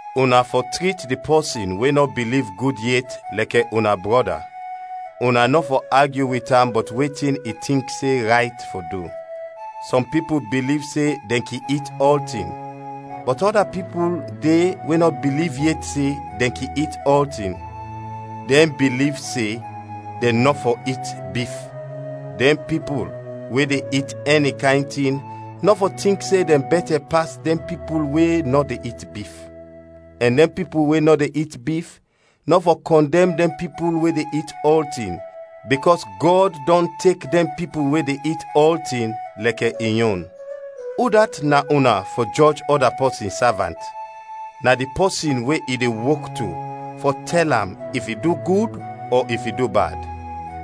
Una fɔ trit di pɔsin we nɔ biliv gud yet lɛkɛ una brɔda, una nɔ fɔ agyu wit am bɔt wetin i tink se rayt fɔ du. Sɔm pipul biliv se dɛn kin it ɔltin, bɔt ɔda pipul de we nɔ biliv yet se dɛn kin it ɔltin, dɛn biliv se dɛn nɔ fɔ it bif. Dɛn pipul we de it ɛni kayn tin nɔ fɔ tink se dɛn bɛtɛ pas dɛn pipul we nɔ de it bif; ɛn dɛn pipul we nɔ de it bif nɔ fɔ kɔndɛm dɛn pipul we de it ɔltin, bikɔs Gɔd dɔn tek dɛn pipul we de it ɔltin lɛkɛ in yon. Udat na una fɔ jɔj ɔda pɔsin savant? Na di pɔsin we i de wok to fɔ tɛl am, if i du gud ɔ if i du bad.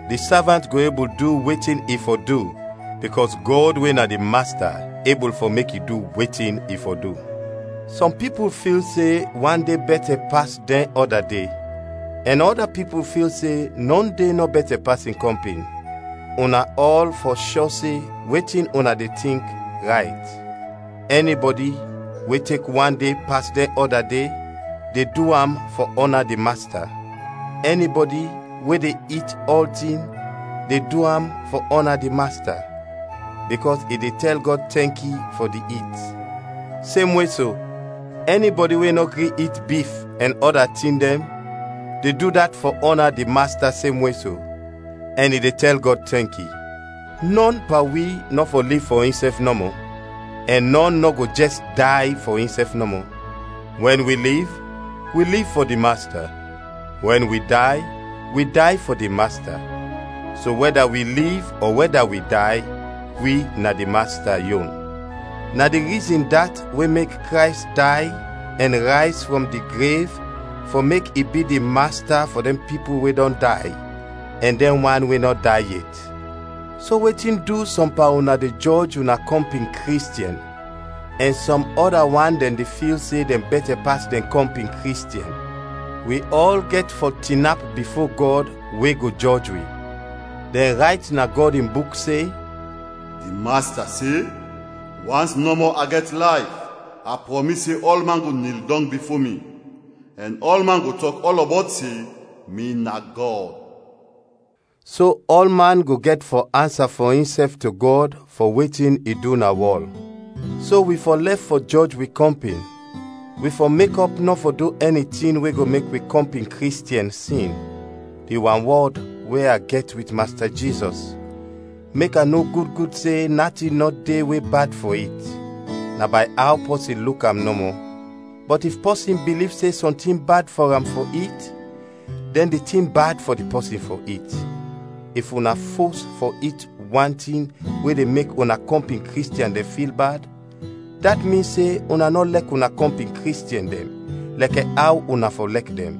Di savant go ebul du wetin i fɔ du bikɔs Gɔd we na di Masta ebul fɔ mek i du wetin i fɔ du. Sɔm pipul fil se wan de bɛtɛ pas dɛn ɔda de, ɛn ɔda pipul fil se nɔ de nɔ bɛtɛ pas in kɔmpin. Una ɔl fɔ shɔ se wetin una de tink, rayt. Ɛnibɔdi we tek wan de pas dɛn ɔda de, de du am fɔ ɔna di Masta. Ɛnibɔdi we de it ɔltin, de du am fɔ ɔna di Masta, bikɔs i de tɛl Gɔd tɛnki fɔ di it. Semwe so, ɛnibɔdi we nɔ gri it bif ɛn ɔda tin dɛn, de du dat fɔ ɔna di Masta semwe so, ɛn i de tɛl Gɔd tɛnki. Nɔn pan wi nɔ fɔ liv fɔ insɛf nɔmɔ; ɛn nɔn nɔ go jɛs day fɔ insɛf nɔmɔ. Wɛn wi liv, wi liv fɔ di Masta; wɛn wi day, wi day fɔ di Masta. So, wɛda wi liv ɔ wɛda wi day, wi na di Masta yon. Na di rizin dat we mek Krays day ɛn rayz frɔm di grev fɔ mek i bi di Masta fɔ dɛn pipul we dɔn day ɛn dɛn wan we nɔ day yet. So wetin du sɔm pan una de jɔj una kɔmpin Kristiɛn, ɛn sɔm ɔda wan dɛn de fil se dɛn bɛtɛ pas dɛn kɔmpin Kristiɛn? Wi ɔl gɛt fɔ tinap bifo Gɔd we go jɔj wi. Dɛn rayt na Gɔd in Buk se, “Di Masta se, wans nɔmɔ a gɛt layf, a prɔmis se ɔlman go nil dɔng bifo mi, ɛn ɔlman go tɔk ɔlɔbɔt se, mi na Gɔd.” So ɔlman go gɛt fɔ ansa fɔ insɛf to Gɔd fɔ wetin i du na wɔl. So wi fɔ lɛf fɔ jɔj wi kɔmpin, wi fɔ mekɔp nɔ fɔ du ɛni tin we go mek wi kɔmpin Kristiɛn sin. Di wanwɔd we a gɛt wit Masta Jizɔs mek a no gud gud se natin nɔ de we bad fɔ it, na bay aw pɔsin luk am nɔmɔ; bɔt if pɔsin biliv se sɔntin bad fɔ am fɔ it, dɛn di tin bad fɔ di pɔsin fɔ it. If una fos fɔ it wan tin we de mek una kɔmpin Kristiɛn dɛn fil bad, dat min se una nɔ lɛk una kɔmpin Kristiɛn dɛn lɛkɛ aw una fɔ lɛk dɛn.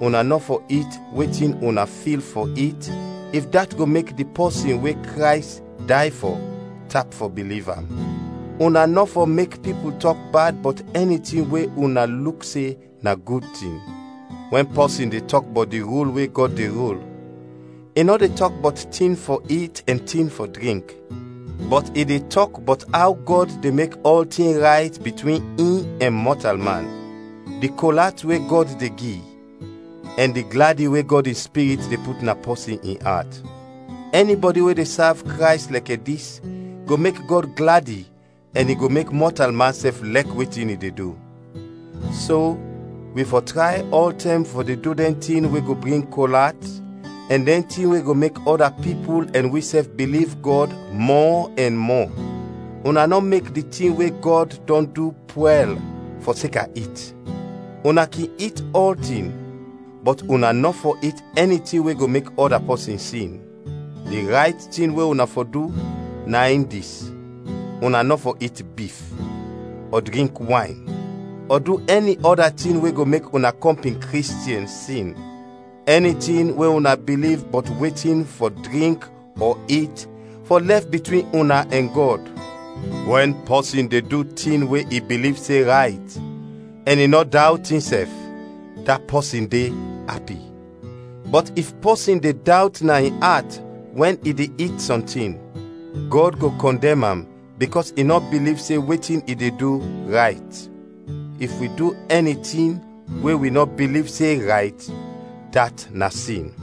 Una nɔ fɔ it wetin una fil fɔ it if dat go mek di pɔsin we Krays day fɔ, tap fɔ biliv am. Una nɔ fɔ mek pipul tɔk bad bɔt ɛni tin we una luk se na gud tin. Wɛn pɔsin de tɔk bɔt di rul we Gɔd de rul, i nɔ de tɔk bɔt tin fɔ it ɛn tin fɔ drink, bɔt i de tɔk bɔt aw Gɔd de mek ɔltin rayt bitwin in ɛn mɔtalman, di kol at we Gɔd de gi, ɛn di gladi we Gɔd in Spirit de put na pɔsin in at. Ɛnibɔdi we de sav Krays lɛkɛ dis go mek Gɔd gladi ɛn i go mek mɔtalman sɛf lɛk wetin i de du. So, wi fɔ tray ɔltɛm fɔ de du dɛn tin we go bring kol at, ɛn dɛn tin we go mek ɔda pipul ɛn wisɛf biliv Gɔd mɔ ɛn mɔ. Una nɔ mek di tin we Gɔd dɔn du pwɛl, fɔseka it. Una kin it ɔltin, bɔt una nɔ fɔ it ɛni tin we go mek ɔda pɔsin sin. Di rayt tin we una fɔ du, na in dis: una nɔ fɔ it bif, ɔ drink wayn, ɔ du ɛni ɔda tin we go mek una kɔmpin Kristiɛn sin. Ɛni tin we una biliv bɔt wetin fɔ drink ɔ it fɔ lɛf bitwin una ɛn Gɔd. Wɛn pɔsin de du tin we i biliv se rayt ɛn i nɔ dawt insɛf, da pɔsin de, api. Bɔt if pɔsin de dawt na in at wɛn i de it sɔntin, Gɔd go kɔndɛm am bikɔs i nɔ biliv se wetin i de du, rayt. If wi du ɛni tin we wi nɔ biliv se rayt, dat na sin.